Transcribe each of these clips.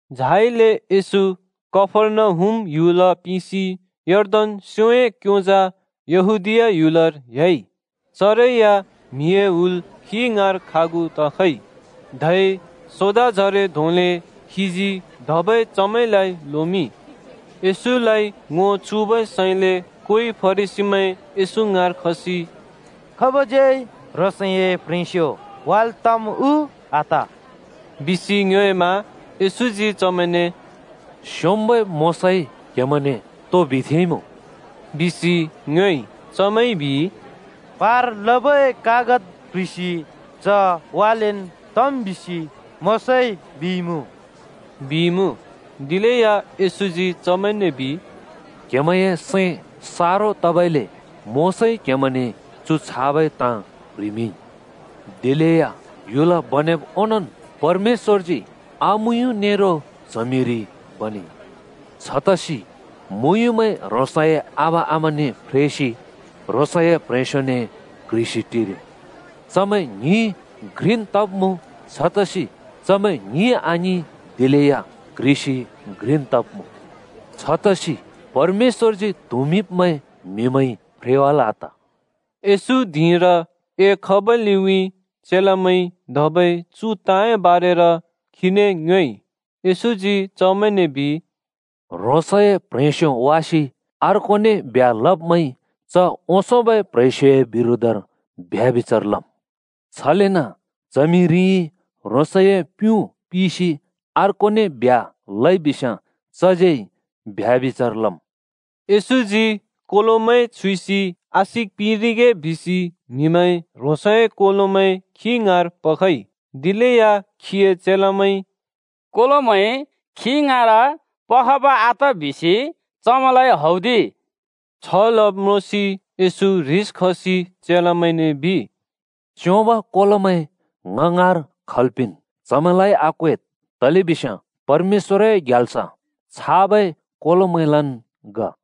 झाइले येशू कफर्नहुम ह्‍युल पिसि यर्दन स्‍योंए क्योंजा यहूदीया ह्‍युलर ह्‍याइ। चरै या म्हिए हुल खी ङाँर खागु तखइ। धै सोदाजरे धोंले खीजी धबै चमैंलाइ लोमिंइ। येशूलाइ ङो चुबै सैंले कोइ फरिसीमैं येशू ङाँर खसि “खाबज्यै ह्रोंसए प्ह्रेंस्यो वाल् तम् उ आत?” बिसि ङ्योएमा येशूजी चमैंने “स्‍योंम्‍बै मोशाइ क्‍हेमैंने तो बिथेंइमुँ?” बिसि ङ्योएइ। चमैंइ बिइ, “पार लबै कागत प्‍ह्रिसि च वालेन् तम् बिसि मोशाइ,” बिइमुँ। दिलेया येशूजी चमैंने बिइ, “क्‍हेमैंए सैं सारो तबइले मोशाइ क्‍हेमैंने चु छाबै ताँ प्‍ह्रिमिंइ। दिलेया ह्‍युल बनेब् ओंनोंन्, ‘परमेश्‍वरजी आमुयुँ नेरो च्हमिरि बनेइ।’ ‘छतसि मुँयुँमैं ह्रोंसए आबा आमाने फ्रेसि ह्रोंसए प्‍ह्रेंस्‍योने क्ह्रिसि टिरिम्। चमैं ङ्हिं घ्रिन् तब्‍मुँ।’ छतसि चमैं ङ्हिं आङिं, दिलेया क्ह्रिसि घ्रिन् तब्‍मुँ। छतसि परमेश्‍वरजी त्हुँमिंब्मैं म्‍हिमैंइ फ्रेवाल् आत।” येशू धिंर एखबै लिउँइँ चेलामैंइ धबै चु ताँए बारेर खीने ङ्योएइ। येशूजी चमैंने बिइ, “ह्रोंसए प्ह्रेंस्यो वासि अर्कोने ब्ह्‍या लब्मैंइ च ओंसोंबै प्ह्रेंस्योए बिरोधर ब्यभिचार लम्। छलेन च्हमिरिइ ह्रोंसए प्युँ पिसि अर्कोने ब्ह्‍या लइबिस्‍याँ चज्यै ब्यभिचार लम्।” येशूजी कोलोमैं छुइसि आशिक पिंरिगे बिसि म्‍हिमैंइ ह्रोंसए कोलोमैं खी ङाँर पखइ। दिलेया खीए चेलामैंइ “कोलोमैं खी ङाँर पखब आत बिसि चमैंलाइ हौदिइ।” छ लब् म्रोंसि येशू ह्रिस खसि चेलामैंने बिइ, “च्योंब कोलोमैं ङ ङाँर खल् पिंन्, चमैंलाइ आक्वेद्, तलेबिस्याँ परमेश्‍वरए ग्याल्स छाबै कोलोमैंलन् ग।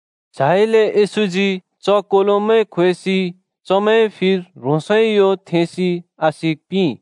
झाइले येशूजी च कोलोमैं ख्‍वेसि चमैंए फिर ह्रोंसए यो थेंसि आशिक पिंइ।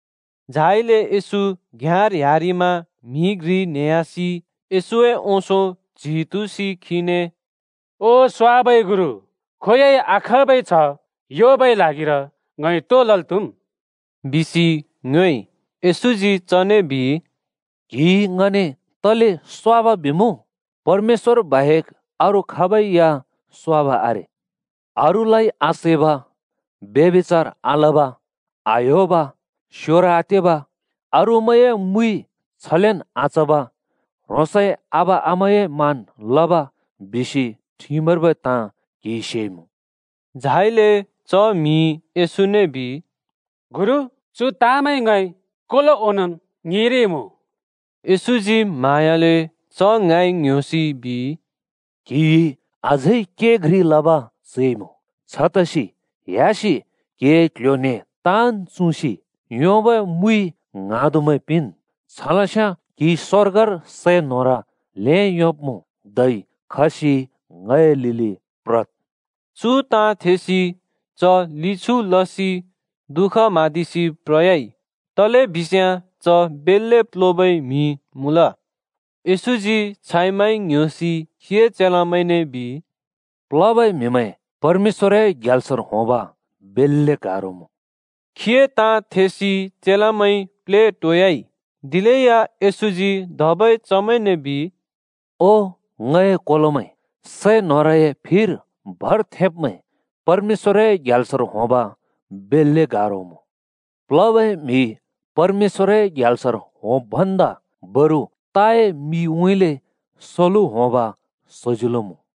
झाइले येशू घ्‍याँर ह्‍यारिमा म्‍हि घ्रि न्हेह्‍यासि येशूए ओंसों च्‍हि तुँसि खीने “ओ स्वाबै गुरु, खोंयोंइ आखाँबै छह् योंबै ल्हागिर ङइ तो लल् त्‍हुम्?” बिसि ङ्योएइ। येशूजी चने बिइ, “ङने तले स्वाब बिमुँ? परमेश्‍वर बाहेक अरू खाबै या स्वाब आरे। अरूलाइ आसैब, ब्यभिचार आलब, आह्‍योब, स्‍योर आतेब, अरूमैंए मुइ छलेन् आचब, ह्रोंसए आबा-आमाए मान् लब बिसि ठिमर्बै ताँ क्‍हिइ सेइमुँ।” झाइले च म्‍हिइ येशूने बिइ, “गुरु, चु ताँमैं ङइ कोलो ओंनोंन् ङिंरिइमुँ।” येशूजी म्हाँयाले च ङाँइ ङ्‌ह्‍योसि बिइ, “क्‍हिइ अझै के घ्रि लब चैमुँ: छतसि ह्‍यासि क्‍हिए क्‍ल्‍ह्‍यो न्‍हें ताँन् चुँसि योंबै मुइ ङ्हाँदुमैं पिंन्, छलस्याँ क्‍हिइ स्‍वर्गर सै न्होर ल्हें योंब्‍मुँ। धै खसि ङए लिलि प्रद्,” बिइ। चु ताँ थेसि च लि छु लसि दुःख म्हाँदिसि प्रयाइ, तलेबिस्याँ च बेल्‍ले प्‍लोबै म्‍हि मुँल। येशूजी छाइ माइ ङ्‌ह्‍योसि खीए चेलामैंने बिइ, “प्‍लोबै म्‍हिमैं परमेश्‍वरए ग्याल्सर होंब बेल्‍ले गारो मुँ।” खीए ताँ थेसि चेलामैं प्लेटोयाइ। दिलेया येशूजी धबै चमैंने बिइ, “ओ ङए कोलोमैं, सै न्होरए फिर भर थेब्मैं परमेश्‍वरए ग्याल्सर होंब बेल्‍ले गारो मुँ। प्‍लोबै म्‍हि परमेश्‍वरए ग्याल्सर होंब् भन्दा बरु ताए मिउँइँले सलु होंब सजिलो मुँ।”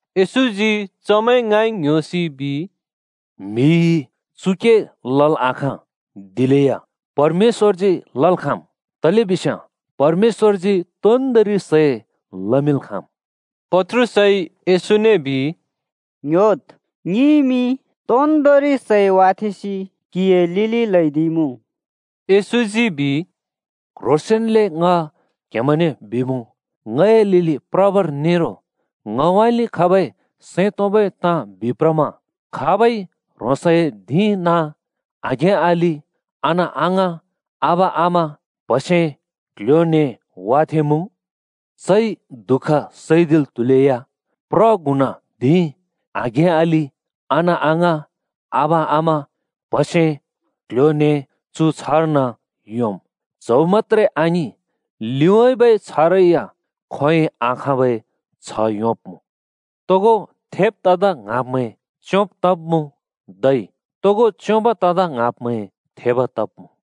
येशूजी चमैं ङाँइ ङ्‌ह्‍योसि बिइ, “म्‍हिइ चु के लल् आखाँ, दिलेया परमेश्‍वरजी लल् खाँम्, तलेबिस्याँ परमेश्‍वरजी तोन्दोंरि सै लमिंल् खाँम्।” पत्रुसइ येशूने बिइ, “ङ्‌ह्‍योद्, ङिइमि तोन्दोंरि सै वाथेंसि क्‍हिए लिलि ल्‍हैदिइमुँ।” येशूजी बिइ, “क्ह्रोंसेंन्ले ङ क्हेमैंने बिमुँ, ङए लिलि प्रबर नेरो ङउँइँले खबै सैं तोंबै ताँ बिप्रमा खाबइ ह्रोंसए धिं नाँ, आघें-अलि, अना-अङाँ, आबा-आमा, प्‍हसे, क्‍ल्‍ह्‍यो-न्‍हें वाथेंमुँ, चइ दुःख सैदिल् त्‍हुलेया प्र गुणा धिं, आघें-अलि, अना-अङाँ, आबा-आमा, प्‍हसे, क्‍ल्‍ह्‍यो न्‍हें चु छ्‍हर्न योंम्। च्‍हौ मत्‍त्रे आङिं, लिउँइँबै छ्‍हरै या खोंयोंइ आखाँबै छह् योंब्‍मुँ। तोगो थेब् तदा ङ्हाँब्‍मैं च्‍योंब् तब्‍मुँ, धै तोगो च्‍योंब तदा ङ्हाँब्‍मैं थेब तब्‍मुँ।”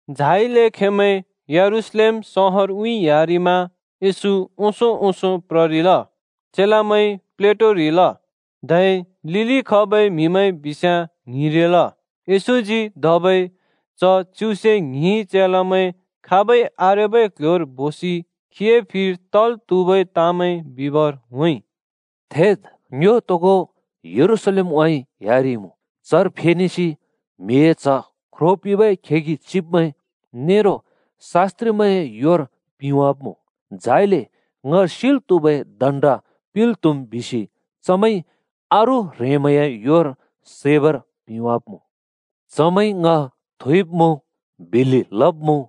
झाइले खेंमैं यरूशलेम सहरउँइँ ह्‍यारिमा। येशू ओंसों ओंसों प्ररिल। चेलामैं प्लेटोरिल, धै लिलि खबै म्‍हिमैं बिस्याँ ङ्हिंरिल। येशूजी धबै च च्युसे ङ्हिं चेलामैं खाबै आरेबै क्ल्ह्‍योर बोसि खीए फिर तल् त्‍हुबै ताँमैं बिबर होंइ: “थेद्, ङ्यो तोगो यरूशलेमउँइँ ह्‍यारिइमुँ। चर फेनेसि म्हिए च्ह ख्रो पिंबै खेगि चिब्मैं नेरो शास्‍त्रिमैंए योर पिंवाब्मुँ। झाइले ङ सिल् त्‍हुबै दण्‍ड पिंल् त्हुम् बिसि चमैंइ अरू ह्रेंमैंए योर सैबर पिंवाब्‍मुँ। चमैंइ ङ थुइब्‍मुँ, बिल्‍लि लब्‍मुँ,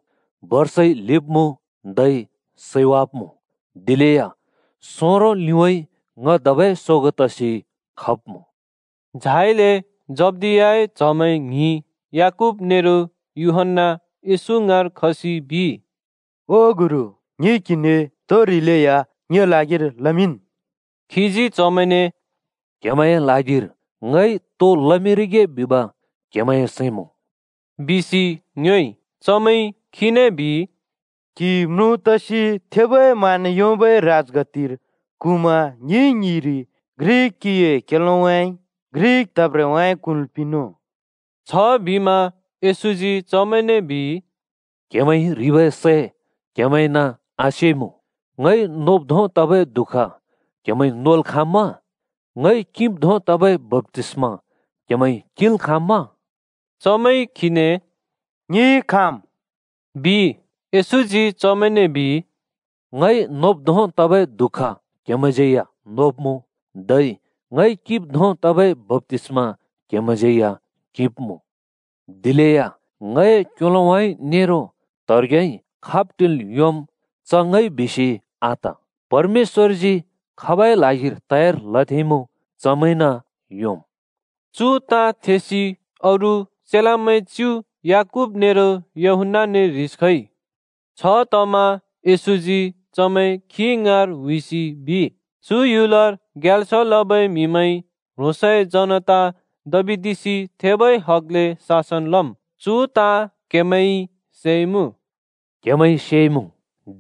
बर्साइ ल्हिब्‍मुँ धै सैवाब्‍मुँ। दिलेया सोंरों लिउँइँ ङ धबै सोगों तसि खब्मुँ।” झाइले जब्दियाए च्‍हमैं ङ्हिं याकूब नेरो यूहन्‍ना येशू ङाँर खसि बिइ, “ओ गुरु, ङिइ क्हिने तो ह्रिलेया ङिए ल्हागिर लमिंन्।” खीजी चमैंने “क्‍हेमैंए ल्हागिर ङइ तो लमिंरिगे बिब क्हेमैंए सैं मुँ?” बिसि ङ्योएइ। चमैंइ खीने बिइ, “क्‍हि म्रुँ तसि थेबै मान योंबै राजगद्दिर क्हुँमा ङि ङ्हिंरि घ्रि क्‍हिए क्‍योलोउँइ, घ्रि त्हेब्रेउँइँ क्हुँल् पिंनुँ।” छबिमा येशूजी चमैंने बिइ, “क्‍हेमैंइ ह्रिबै सै क्‍हेमैंन आसेइमुँ। ङइ नोब् धों तबै दुःख क्‍हेमैंइ नोल् खाँम्‍मा? ङइ किंब् धों तबै बप्‍तिस्मा क्‍हेमैंइ किंल् खाँम्‍मा?” चमैंइ खीने, “ङिइ खाँम्!” बिइ। येशूजी चमैंने बिइ, “ङइ नोब् धोंबै दुःख क्हेमैंज्यै या नोब्‍मुँ, धै ङइ किंब् धोंबै बप्‍तिस्मा क्‍हेमैंज्यै या किंब्‍मुँ। दिलेया ङए क्‍योलोउँइँ नेरो त्हेब्रेउँइँ खाब् टिल् योंम्, च ङइ बिसि आत, परमेश्‍वरजी खाबए ल्हागिर तयार लथेंइमुँ चमैंन योंम्।” चु ताँ थेसि अरू चेलामैं च्‍यु याकूब नेरो यूहन्‍नाने ह्रिस खइ। छतमा येशूजी चमैं खी ङाँर हुइसि बिइ, चु ह्‍युलर ग्याल्स लबै म्‍हिमैंइ ह्रोंसए जनता दबिदिसि थेबै हगले शासन लम्, चु ताँ “क्‍हेमैंइ सेइमुँ।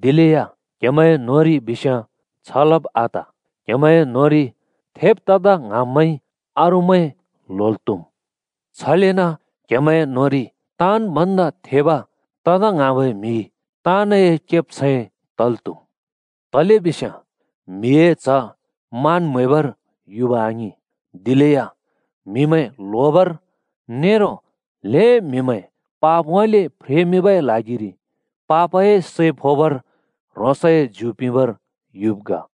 दिलेया क्‍हेमैंए न्होंरि बिस्याँ छ लब् आत। क्‍हेमैंए न्होंरि थेब् तदा ङ्हाँब्मैंइ, अरूमैं ल्होल् त्‍हुम्। छलेन क्हेमैंए न्होंरि ताँन् भन्दा थेब तदा ङ्हाँबै म्हि ताँनए केब्छैं तल् त्‍हुम्। तलेबिस्याँ म्हिए च्ह मान म्हैबर युब आङिं, दिलेया म्हिमैं ल्होबर नेरो ल्‍हें म्‍हिमैंए पापउँइँले फ्रेमिंबै ल्हागिरि पापए सै फोबर ह्रोंसए ज्यु पिंबर युब् ग।”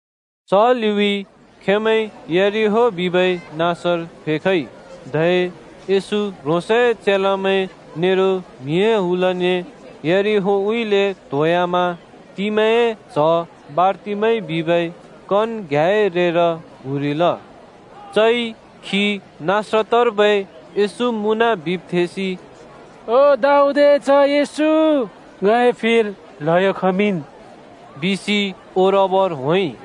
च लिउँइँ खेंमैं यरिहो बिबै नाँसर फेखइ, धै येशू ह्रोंसए चेलामैं नेरो म्हिए हुलने यरिहोउँइँले त्‍होंह्‍यामा तिमैए च्‍ह बारतिमै बिबै कन घ्याँए रेर क्हुँरिल। चइ खी नासरतर्बै येशू मुँन बिब् थेसि “ओ दाऊदए च्ह येशू, ङए फिर ल्हयो खमिंन्,” बिसि ओरबर होंइ।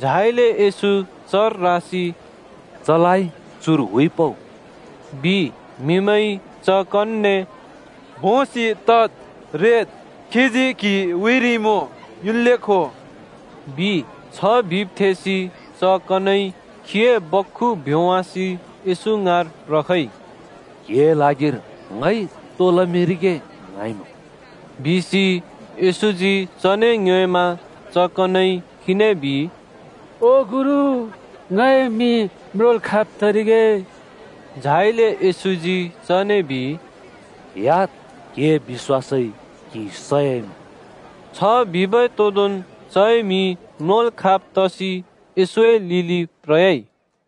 झाइले येशू चर रासि “चलाइ चुर हुइपउ,” बिइ। म्‍हिमैंइ च कनने “भोंसि तद्, रेद्, खीजी क्‍हि हुइरिइमुँ युन्ले खो,” बिइ। छ बिब् थेसि च कनइ ह्रोंसए बख्खु भ्‍योंवासि येशू ङाँर प्रखइ। “क्‍हिए ल्हागिर ङइ तो लमिंरिगे ङ्हाँइमुँ?” बिसि येशूजी चने ङ्योएमा च कनइ खीने बिइ, “ओ गुरु, ङए मि म्रोंल् खाँब् तरिगे।” झाइले येशूजी चने बिइ, “ह्‍याद्! क्‍हिए बिश्‍वासइ क्हि सयाइमुँ।” छ बिबै तोदोंन् चए मि म्रोंल् खाँब् तसि येशूए लिलि प्रयाइ।